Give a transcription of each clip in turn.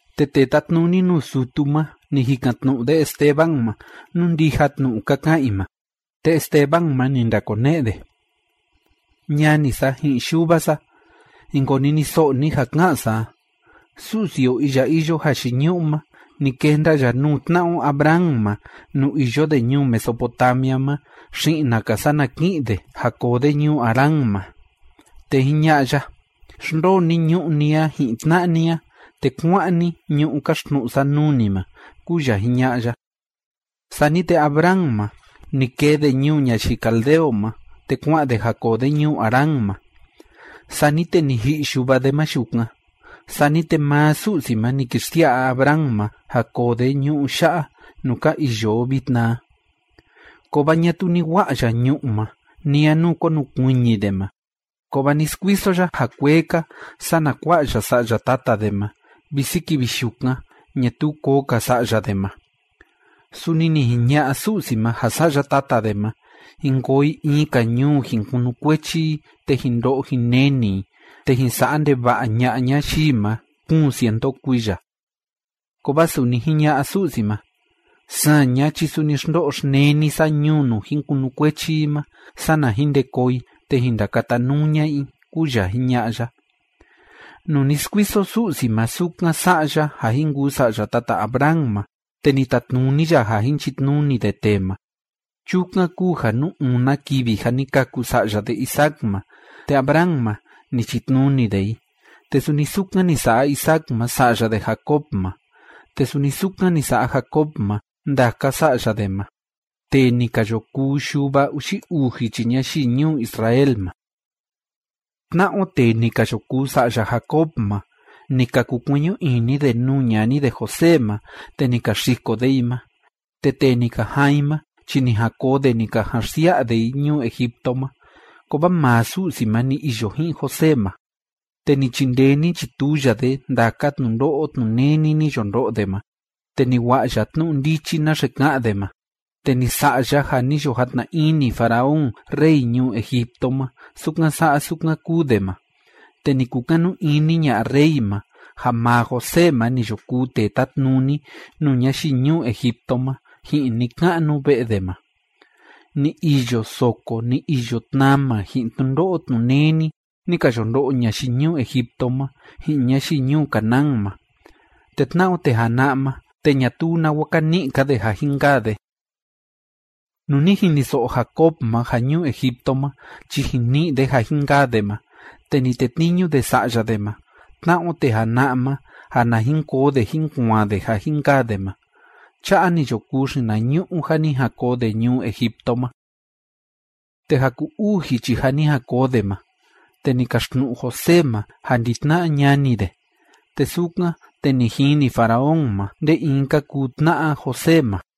Te tee tatnuni nuu sutu ma, ni jikan‑tnu'u de Esteban ma nú ndija tnu'u ka ka'an i ma. Te Esteban ma, ni ndakone'e de: ―Ñani sa ji'in yuva sa, jin koniniso'o ni ja ká'an sa a. Su'si o iya iyo jayiñu'u ma, ni kenda ya nuu tna'a o Abraham ma nuu iyo de ñuu Mesopotamia ma xi'na‑ka sana ki'in de ja koo de ñuu Harán ma. Te jiña'a ya: “Xndoo ni ñu'ú ni a ji'in tna'a ni a, te kuá'an ni ñu'ú kaxtnu'u sa nuu ni ma”, kúu ya jiña'a ya. Sani te Abraham ma, ni kee de ñuu ñayii caldeo ma, te kua'an de ja koo de ñuu Harán ma. Sani te ni ji'i yuva de ma yukan, sani te maa Su'si ma ni ki xsia'a Abraham ma ja koo de ñu'ú ya'a nuu ka iyo o vitna a. Kovaa ñatuu ni wa'a ya ñu'ú ma, ni a nuu konukuiñi de ma, kovaa ni skuiso ya ja kuee‑ka, sana kua'a ya sa'ya tata de ma, visi kivi yukan ñatuu koo‑ka sa'ya de ma. Suni ni jiña'a Su'si ma ja sa'ya tata de ma, jin koo i in‑ka ñuu jin kunukuechi i, te jin ndo'o jin neni i, te jin sa'a ndeva'a ña'a ñayii ma kuun cientu kuiya. Kovaa suni jiña'a Su'si ma: “Saña chi suni xndo'o xneni sa ñuu nuu jin kunukuechi i ma. Sana jin nde koo i, te jin ndakatanuu ña'a i”, kúu ya jiña'a ya. Nuu ni skuiso Su'si ma sukan sa'a ya ja jin kuu sa'ya tata Abraham ma, te ni tatnuni ya ja jin chitnuni de tee ma. Chukan kúu ja nuu una kivi ja ni kâku sa'ya de Isaac ma, te Abraham ma, ni chitnuni de i, te suni sukan ni sa'a Isaac ma sa'ya de Jacob ma, te suni sukan ni sa'a Jacob ma ndaka sa'ya de ma, tee ni ka yo kuu yuva uxi uu jichi ñayii ñuu Israel ma. ’Tna'a o tee ni ka yo kuu sa'ya Jacob ma, ni ka kukueñu ini de nuu ñani de José ma, te ni ka xiko de i ma, te tee ni ka jaan i ma chi ni jan koo de ni ka jan xsia'a de i ñuu Egipto ma. Kovaa maa Su'si ma ni iyo ji'in José ma. Te ni chindee ni chituu ya de ndaka tnundo'o tnuneni ni yo ndo'o de ma, te ni wa'a ya tnu'u ndichi naxe ka'an de ma, te ni sa'a ya ja ni yo jatna ini faraón rey ñuu Egipto ma sukan sa'a sukan kúu de ma, te ni kukanu ini ña'a rey ma ja maa José ma ni yo kuu tee tátnuni nuu ñayii ñuu Egipto ma ji'in ni‑ka'nu ve'e de ma. ’Ni iyo soko ni iyo tnama ji'in tnundo'o tnuneni ni ka yo ndo'o ñayii ñuu Egipto ma ji'in ñayii ñuu Canaán ma. Te tna'a o tee jana'a ma, te ñatuu nawa ka ni'i‑ka de ja jin kaa de. Nuu ni jiniso'o Jacob ma ja ñuu Egipto ma chi jin ni'i de ja jin kaa de ma, te ni tetniñu de sa'ya de ma tna'a o tee jana'a ma ja na jin koo de jín kuaan de ja jin kaa de ma. Cha'a ni yo kuu xinañu'u ja ni jan koo de ñuu Egipto ma. Te ja ku‑uu jichi ja ni jan koo de ma, te ni kaxtnu'u José ma ja ndi‑tna'a ñani de, te sukan, te ni jini faraón ma nde in ka kuu tna'a José ma.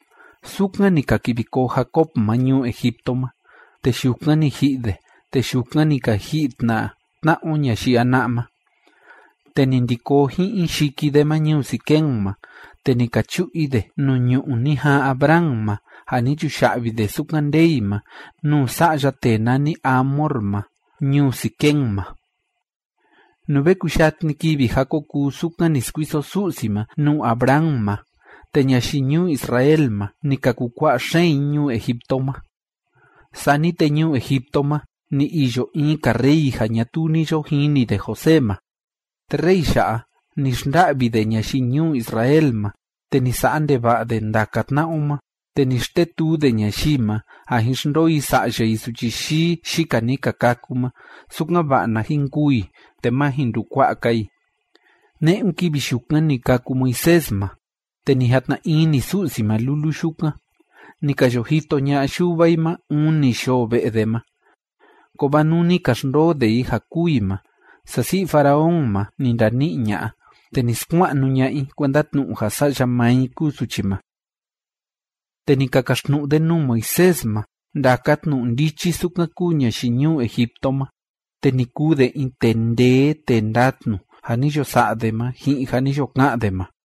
Sukan ni ka kivi koo Jacob ma ñuu Egipto ma, te yukan ni ji'i de, te yukan ni ka ji'i tna tna'a o ñayii jana'a ma. Te ni ndi koo ji'in i yiki de ma ñuu Siquem ma, te ni ka chu'u i de nuu ñu'ú ni jaan Abraham ma, ja ni chuya'vi de sukan ndee i ma nuu sa'ya tee nani Hamor ma ñuu Siquem ma. ’Nuu ve kuyatni kivi ja ko kuu sukan ni skuiso Su'si ma nuu Abraham ma, te ñayii ñuu Israel ma, ni ka kukua'a xeen i ñuu Egipto ma. Sani te ñuu Egipto ma ni iyo in‑ka rey ja ñatuu ni yo jini de José ma. Te rey ya'a, ni xnda'vi de ñayii ñuu Israel ma, te ni sa'a ndeva'a de ndaka tna'a o ma, te ni xtetuu de ñayii ma ja jin xndoo i sa'ya i suchi yii yika ni ka kâku ma, sukan‑va'a na jin kûu i te ma jin ndukua'a‑ka i. Ne'un kivi yukan ni kâku Moisés ma, te ni jatna ini Su'si ma lulu yukan. Ni ka yo jito ña'a yuva i ma uni yoo ve'e de ma. Kovaa nuu ni ka xndoo de i ja kûu i ma, sasi'i faraón ma ni ndani'i ña'a, te ni skua'nu ña'a i kuenda tnu'u ja sa'ya maa i kúu suchi ma. Te ni ka kaxtnu'u de nuu Moisés ma ndaka tnu'u ndichi sukan kúu ñayii ñuu Egipto ma, te ni kuu de in tee ndee tee ndatnu ja ni yo sa'a de ma ji'in ja ni yo ka'an de ma.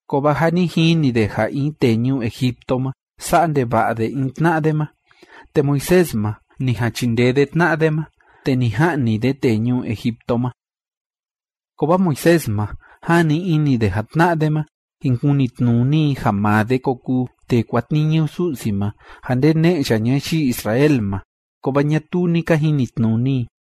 Kovaa ja ni jini de ja in tee ñuu Egipto ma, sa'a ndeva'a de in tna'a de ma, te Moisés ma, ni jan chindee de tna'a de ma, te ni ja'ni de tee ñuu Egipto ma. Kovaa Moisés ma, jani ini de ja tna'a de ma, jin kunitnuni i ja maa de ko kuu tee kuatniñu Su'si ma ja ndene'e ya ñayii Israel ma, kovaa ñatuu ni ka jinitnuni i.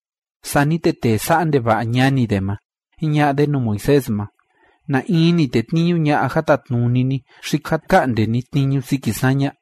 Sani te tee sa'a ndeva'a ñani de ma, jiña'a de nuu Moisés ma: “¿Na in ni tetniñu ña'a ja tatnuni ni xi ja ka'nde ni tniñu siki saña?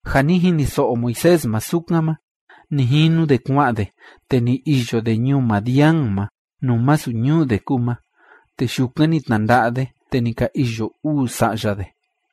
Ja ni jiniso'o Moisés ma sukan ma, ni jinu de kua'an de, te ni iyo de ñuu Madián ma nuu masu ñuu de kúu ma, te yukan ni tnanda'a de, te ni ka iyo uu sa'ya de.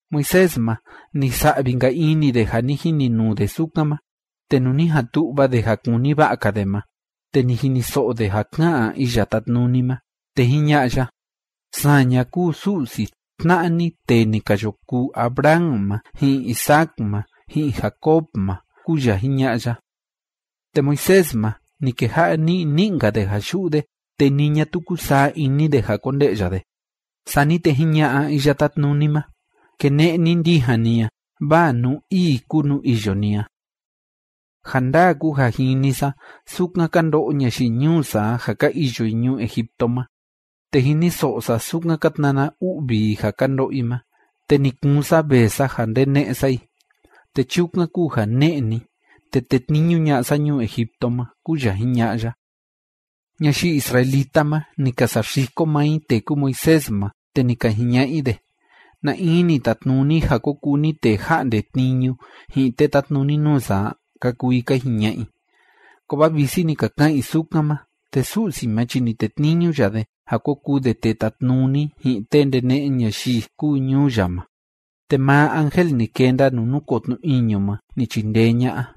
Moisés ma, ni sa'vi‑nka ini de ja ni jininuu de sukan ma, te nuu ni jan tu'va de ja kuni va'a‑ka de ma, te ni jiniso'o de ja ká'an Iya Tátnuni ma, te jiña'a ya: “Saña kúu Su'si tna'a ni tee ni ka yo kuu Abraham ma, ji'in Isaac ma, ji'in Jacob ma”, kúu ya jiña'a ya. Te Moisés ma, ni keja'a ni'i ni'i‑nka de ja yu'u de, te ni ñatuu kúsaa ini de ja konde'ya de. Sani te jiña'a Iya Tátnuni ma: “Kene'e ni ndijan ni a, vaa nuu ii kúu nuu iyo ni a. Ja ndaa kúu ja jini sa sukan ka ndo'o ñayii ñuu sa a ja ka iyo i ñuu Egipto ma, te jiniso'o sa sukan ka tnana u'vi i ja ka ndo'o i ma, te ni kuun sa vee sa ja ndene'e sa i. Te chukan kúu ja ne'e ni, te tetniñu ña'a sa ñuu Egipto ma”, kúu ya jiña'a ya. ’Ñayii israelita ma, ni ka saxiko maa i tee kúu Moisés ma, te ni ka jiña'a i de: “¿Na in ni tatnuni ja ko kuu ni tee ja'nde tniñu ji'in tee tátnuni nuu sa a?”, ka kuu i ka jiña'a i. Kovaa visi ni ka ka'an i sukan ma, te Su'si ma chi ni tetniñu ya de ja ko kuu de tee tatnuni ji'in tee ndene'e ñayii kúu ñuu ya ma, te maa ángel ni kenda nuu núkoo tnu iñu ma ni chindee ña'a.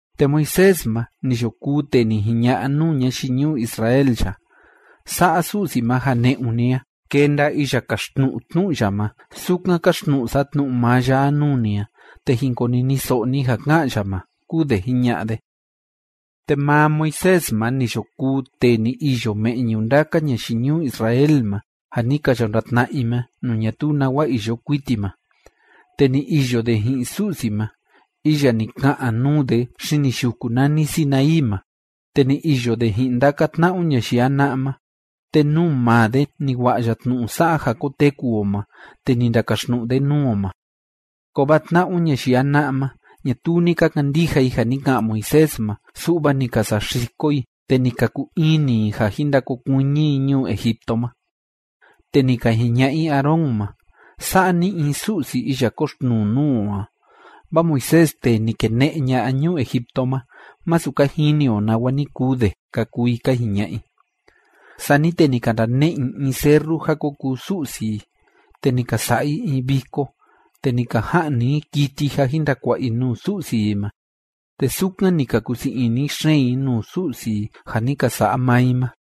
Te Moisés ma ni yo kuu tee ni jiña'a nuu ñayii ñuu Israel ya: “Sa'a Su'si ma ja ne'un ni a kenda iya kaxtnu'u tnu'u ya ma sukan káxtnu'u sa tnu'u maa ya a nuu ni a, te jin koniniso'o ni ja ka'an ya ma”, kúu de jiña'a de. Te maa Moisés ma ni yo kuu tee ni iyo me'ñu ndaka ñayii ñuu Israel ma ja ni ka yo ndatna'a i ma nuu ñatuu nawa iyo kuiti ma. Te ni iyo de ji'in Su'si ma iya ni ka'an nuu de xini yuku nani Sinaí ma. Te ni iyo de ji'in ndaka tna'a o ñayii jana'a ma. Te nuu maa de ni wa'a ya tnu'u sa'a ja koteku o ma, te ni ndakaxtnu'u de nuu o ma. Kovaa tna'a o ñayii jana'a ma, ñatuu ni ka kandija i ja ni ka'an Moisés ma, su'va ni ka saxiko i, te ni ka kuu ini i ja jin ndakokuiñi i ñuu Egipto ma. Te ni ka jiña'a i Aarón ma: “Sa'a ni in su'si iya kóxtnuu nuu o a, vaa Moisés tee ni kene'e ña'a ñuu Egipto ma, masu ka jini o nawa ni kuu de”, ka kuu i ka jiña'a i. Sani te ni ka ndane'e i in serru ja ko kuu su'si i, te ni ka sa'a i in viko, te ni ka ja'ni i kiti ja jin ndakua'a i nuu su'si i ma, te sukan ni ka kusii ini xeen i nuu su'si i ja ni ka sa'a maa i ma.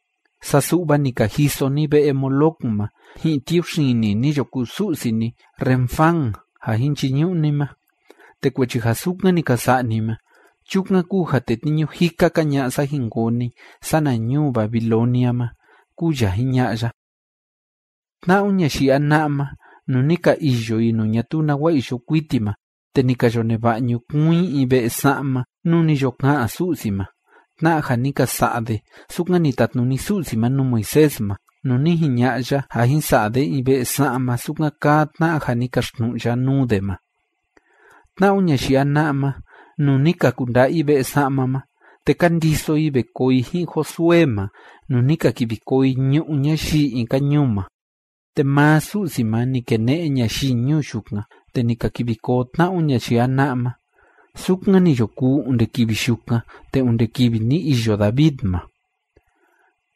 Saa su'va ni ka jiso ni ve'e Moloc ma ji'in tiuxini ni yo kuu su'si ni Renfán ja jin chiñu'u ni ma. Te kuechi ja sukan ni ka sa'a ni ma, chukan kúu ja tetniñu jika‑ka ña'a sa jin koo ni sana ñuu Babilonia ma, kúu ya jiña'a ya. ’Tna'a o ñayii jana'a ma, nuu ni ka iyo i nuu ñatuu nawa iyo kuiti ma, te ni ka yo neva'a ñukuun i in ve'e sa'ma nuu ni yo ka'an Su'si ma, tna'a ja ni ka sa'a de sukan ni tatnuni Su'si ma nuu Moisés ma, nuu ni jiña'a ya ja jin sa'a de in ve'e sa'ma sukan kaa tna'a ja ni kaxtnu'u ya nuu de ma. Tna'a o ñayii jana'a ma, nuu ni ka kunda'a i ve'e sa'ma ma, te ka ndiso i ve koo i ji'in Josué ma nuu ni ka kivi koo i ñu'ú ñayii in‑ka ñuu ma. Te maa Su'si ma ni kene'e ñayii ñuu yukan, te ni ka kivi koo tna'a o ñayii jana'a ma, sukan ni yo kuu onde kivi yukan te onde kivi ni iyo David ma.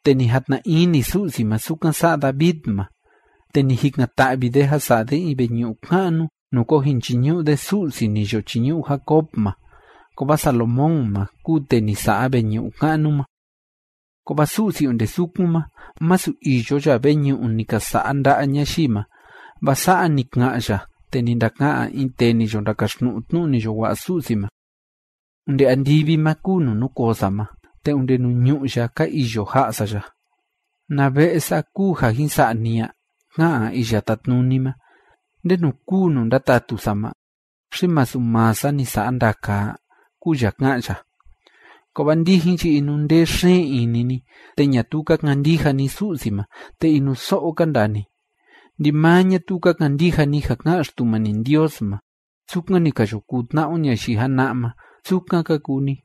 Te ni jatna ini Su'si ma sukan sa'a David ma, te ni jikan‑ta'vi de ja sa'a de in veñu'u ka'nu nuu ko jin chiñu'u de Su'si ni yo chiñu'u Jacob ma. Kovaa Salomón ma kúu tee ni sa'a veñu'u ka'nu ma. Kovaa Su'si onde sukun ma, masu iyo ya veñu'u ni ka sa'a nda'a ñayii ma, vaa sa'a ni ka'an ya te ni ndaka'an in tee ni yo ndakaxtnu'u tnu'u ni yo wa'a Su'si ma: Onde andivi ma kúu nuu núkoo sa ma, te onde nuu ñu'ú ya ka iyo ja'a sa ya. ¿Na ve'e sa kúu ja jin sa'a ni a?, ká'an Iya Tátnuni ma. ¿Ndenu kúu nuu ndatatu sa ma? ¿Xi masu maa sa ni sa'a ndaka a? kúu ya ká'an ya. ’Kovaa ndijin chi inundee xeen ini ni, te ñatuu ka kandija ni Su'si ma, te inuso'o ka ndaa ni. Ndimaa ñatuu ka kandija ni ja ká'an Xtumani Ndios ma. Sukan ni ka yo kuu tna'a o ñayii jana'a ma, sukan ka kuu ni.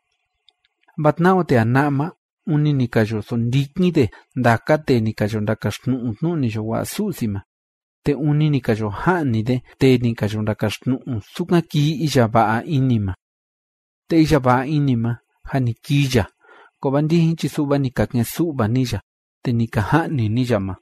Vaa tna'a o tee jana'a ma, ûni ni ka yo sondikin de ndaka tee ni ka yo ndakaxtnu'u tnu'u ni yo wa'a Su'si ma. Te ûni ni ka yo ja'ni de tee ni ka yo ndakaxtnu'u sukan kii iya va'a ini ma. Te iya va'a ini ma, jâ ni kii ya, kovaa ndijin chi su'va ni ka ke'en‑su'va ni ya, te ni ka ja'ni ni ya ma.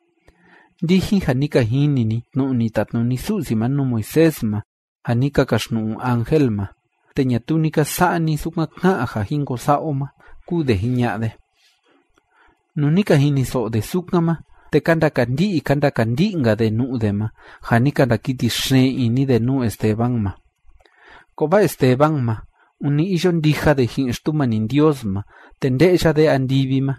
’Ndijin ja ni ka jini ni tnu'u ni tatnuni Su'si ma nuu Moisés ma ja ni ka kaxtnu'u ángel ma, te ñatuu ni ka sa'a ni sukan ká'an ja jin ko sa'a o ma ―kúu de jiña'a de. Nuu ni ka jiniso'o de sukan ma, te ka ndakandi'i ka ndakandi'i‑nka de nu'u de ma, ja ni ka ndakiti xeen ini de nuu Esteban ma. Kovaa Esteban ma, ûni iyo ndija de ji'in Xtumani Ndios ma, te nde'ya de andivi ma,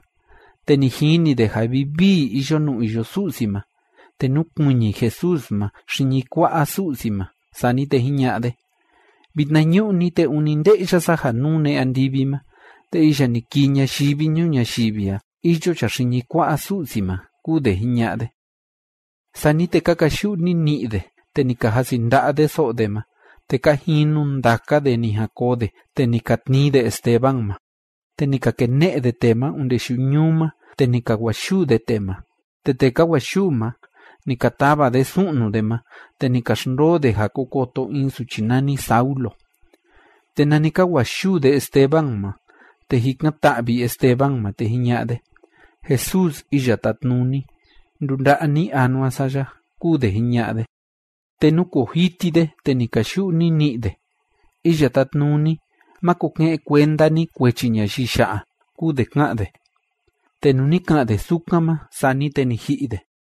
te ni jini de ja vivii iyo nuu iyo Su'si ma, te núkuiñi Jesús ma xiñi kua'a Su'si ma. Sani te jiña'a de: ―Vitnañu'ni te ûni nde'ya sa ja nune andivi ma, te iya ni kii ñayivi ñuu ñayivi a, iyo ya xiñi kua'a Su'si ma ―kúu de jiña'a de. Sani te ka kayu'u nini'i de, te ni ka jasi nda'a de so'o de ma, te ka jinu ndaka de ni jan koo de, te ni ka tnii de Esteban ma, te ni ka kene'e de tee ma onde yuñuu ma, te ni ka wa'a yuu de tee ma. Te tee ka wa'a yuu ma, ni ka tava de su'nu de ma, te ni ka xndoo de ja ko koto in suchi nani Saulo. Te nani ka wa'a yuu de Esteban ma, te jikan‑ta'vi Esteban ma, te jiña'a de: ―Jesús Iya Tátnuni, ndunda'a ni anua sa ya ―kúu de jiña'a de. Te núkoo jiti de, te ni kayu'u nini'i de: ―Iya Tátnuni, máko ke'en kuenda ni kuechi ñayii ya'a ―kúu de ká'an de. Te nuu ni ka'an de sukan ma, sani te ni ji'i de.